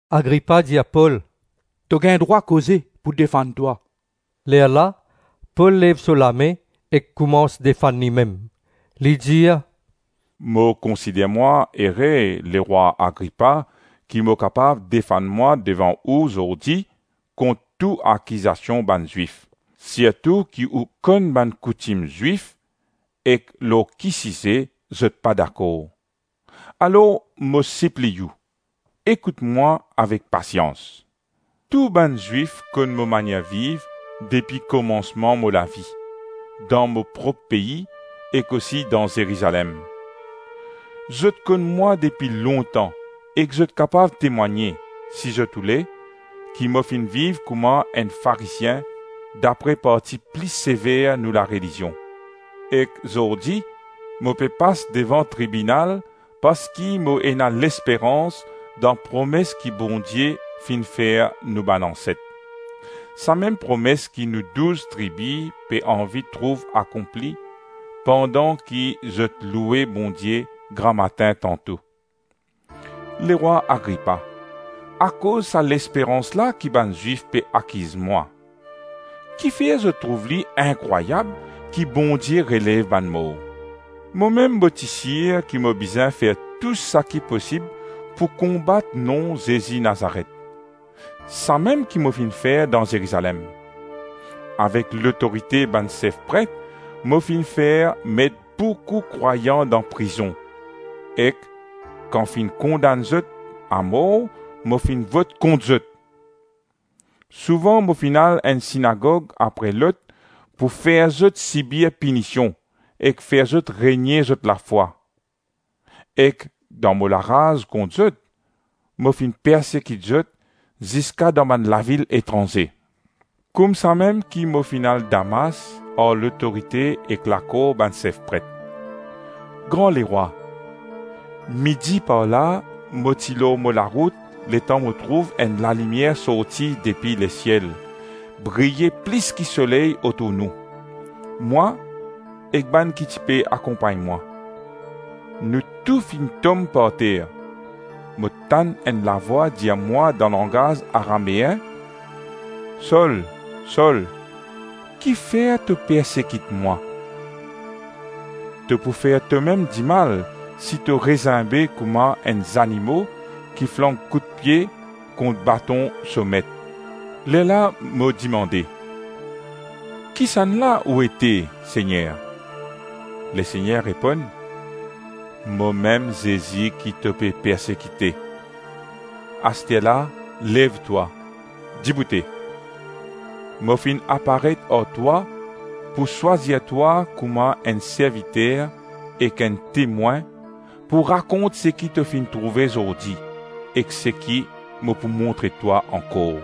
Agripa dir Pol, “To gagn drwa koze pou defann twa.” Lerla Pol lev so lame ek koumans defann limem, li dir, “Mo konsider mwa ere, lerwa Agripa, ki mo kapav defann mwa devan ou zordi kont tou akizasion bann Zwif, sirtou ki ou konn bann koutim Zwif ek lor ki size zot pa dakor. Alor mo sipliy ou, ekout mwa avek pasians. Tou bann Zwif konn mo manier viv depi komansman mo lavi, dan mo prop pei, ek osi dan Zerizalem. Zot konn mwa depi lontan ek zot kapav temwagne, si zot oule, ki mo finn viv kouma enn Farizien dapre parti pli sever nou larelizion. Ek zordi mo pe pas devan tribinal parski mo ena lesperans dan promes ki Bondie finn fer nou bann anset. Samem promes ki nou douz tribi pe anvi trouv akonpli, pandan ki zot loue Bondie gramatin tanto. Lerwa Agripa, akoz sa lesperans la ki bann Zwif pe akiz mwa. Kifer zot trouv li inkrwayab ki Bondie relev bann mor? Momem mo ti sir ki mo bizin fer tou saki posib pou konbat nom Zezi Nazaret. Samem ki mo finn fer dan Zerizalem. Avek lotorite bann sef pret mo finn fer met boukou krwayan dan prizon, ek kan finn kondann zot amor mo finn vot kont zot. Souvan mo finn al enn sinagog apre lot pou fer zot sibir pinision ek fer zot renie zot lafwa. Ek dan mo laraz kont zot, mo finn persekit zot ziska dan bann lavil etranze. Koumsamem ki mo finn al Damas ar lotorite ek lakor bann sef pret. Gran Lerwa, midi parla, mo ti lor mo larout letan mo trouv enn lalimier sorti depi lesiel, briye plis ki soley otour nou, mwa ek bann ki ti pe akonpagn mwa. Nou tou finn tom parter; mo tann enn lavwa dir mwa dan langaz Arameen, ‘Sol, Sol, ki fer to persekit mwa? To pou fer tomem dimal si to rezimbe kouma enn zanimo ki flank koudpie kont baton so met.’ Lerla mo dimande, ‘Kisannla ou ete, Segner?’ Lesegner reponn, ‘Momem Zezi ki to pe persekite. Asterla lev twa, diboute. Mo finn aparet ar twa pou swazir twa kouma enn serviter ek enn temwin pou rakont seki to finn trouve zordi, ek seki mo pou montre twa ankor.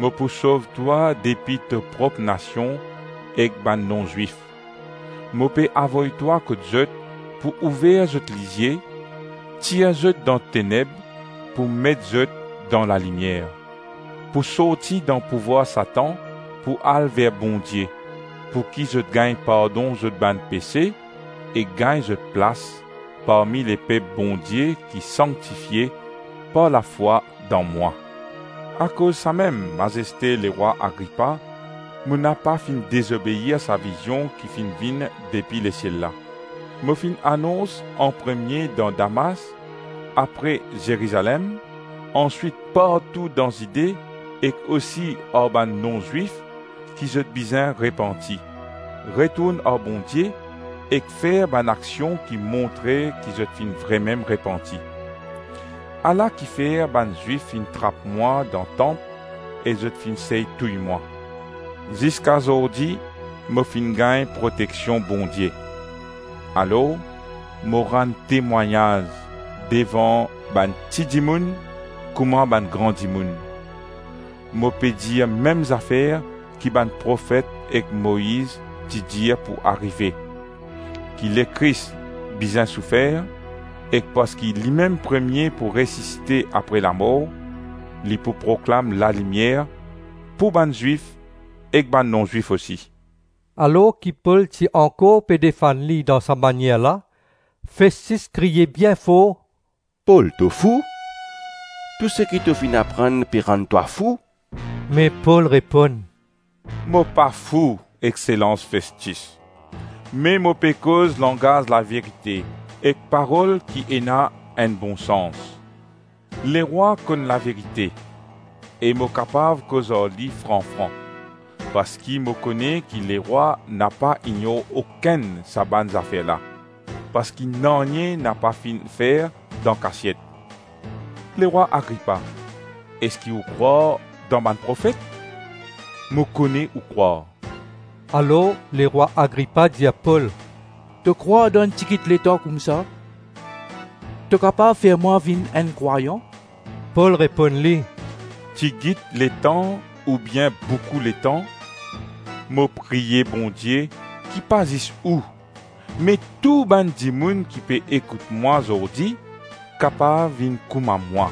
Mo pou sov twa depi to prop nasion ek bann non-Zwif. Mo pe avoy twa kot zot pou ouver zot lizie, tir zot dan teneb pou met zot dan lalimier; pou sorti dan pouvwar Satan pou al ver Bondie, pouki zot gagn pardon zot bann pese ek gagn zot plas parmi lepep Bondie ki sanktifie par lafwa dan mwa.’ Akoz samem, mazeste lerwa Agripa, mo napa finn dezobeir sa vizion ki finn vinn depi lesiel la. Mo finn anons anpremie dan Damas, apre Zerizalem, answit partou dan Zide ek osi ar bann non-Zwif ki zot bizin repanti, retourn ar Bondie ek fer bann aksion ki montre ki zot finn vremem repanti. Ala kifer bann Zwif finn trap mwa dan tanp e zot finn sey touy mwa. Ziska zordi mo finn gagn proteksion Bondie; alors mo rann temwagnaz devan bann ti dimoun kouma bann gran dimoun. Mo pe dir mem zafer ki bann profet ek Moiz ti dir pou arive: ki Lekris bizin soufer, ek parski limem premie pou resisite apre lamor, li pou proklam lalimier pou bann Zwif ek bann non-Zwif osi.” Alors ki Pol ti ankor pe defann li dan sa manier la, Festis kriye bien for, “Pol, to fou. Tou seki to finn aprann pe rann twa fou.” Me Pol reponn, “Mo pa fou, exselans Festis, me mo pe koz langaz laverite ek parol ki ena enn bon sans. Lerwa konn laverite e mo kapav koz ar li fran-fran. Parski mo kone ki lerwa napa ignor okenn sa bann zafer la, parski nanye napa finn fer dan kasiet. Lerwa Agripa, eski ou krwar dan bann profet? Mo kone ou krwar.” Alor lerwa Agripa dir Pol, “To krwar dan enn tigit letan koumsa to kapav fer mwa vinn enn krwayan?” Pol reponn li, “Tigit letan oubien boukou letan, mo priye Bondie ki pa zis ou me tou bann dimoun ki pe ekout mwa zordi kapav vinn kouma mwa,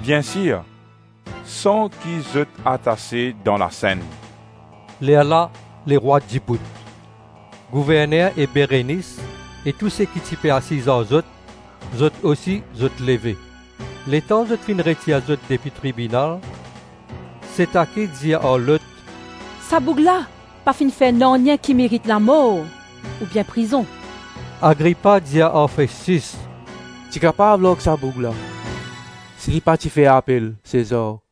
bien sir san ki zot atase dan lasenn.” Lerla lerwa dibout. Gouverner e Berenis e tou seki ti pe asiz ar zot, zot osi zot leve. Letan zot finn retir zot depi tribinal, setaki dir ar lot, “Sa boug la pa finn fer nanye ki merit lamor oubien prizon.” Agripa dir ar Festis, “Ti kapav larg sa boug la si li pa ti fer apel Sezar.”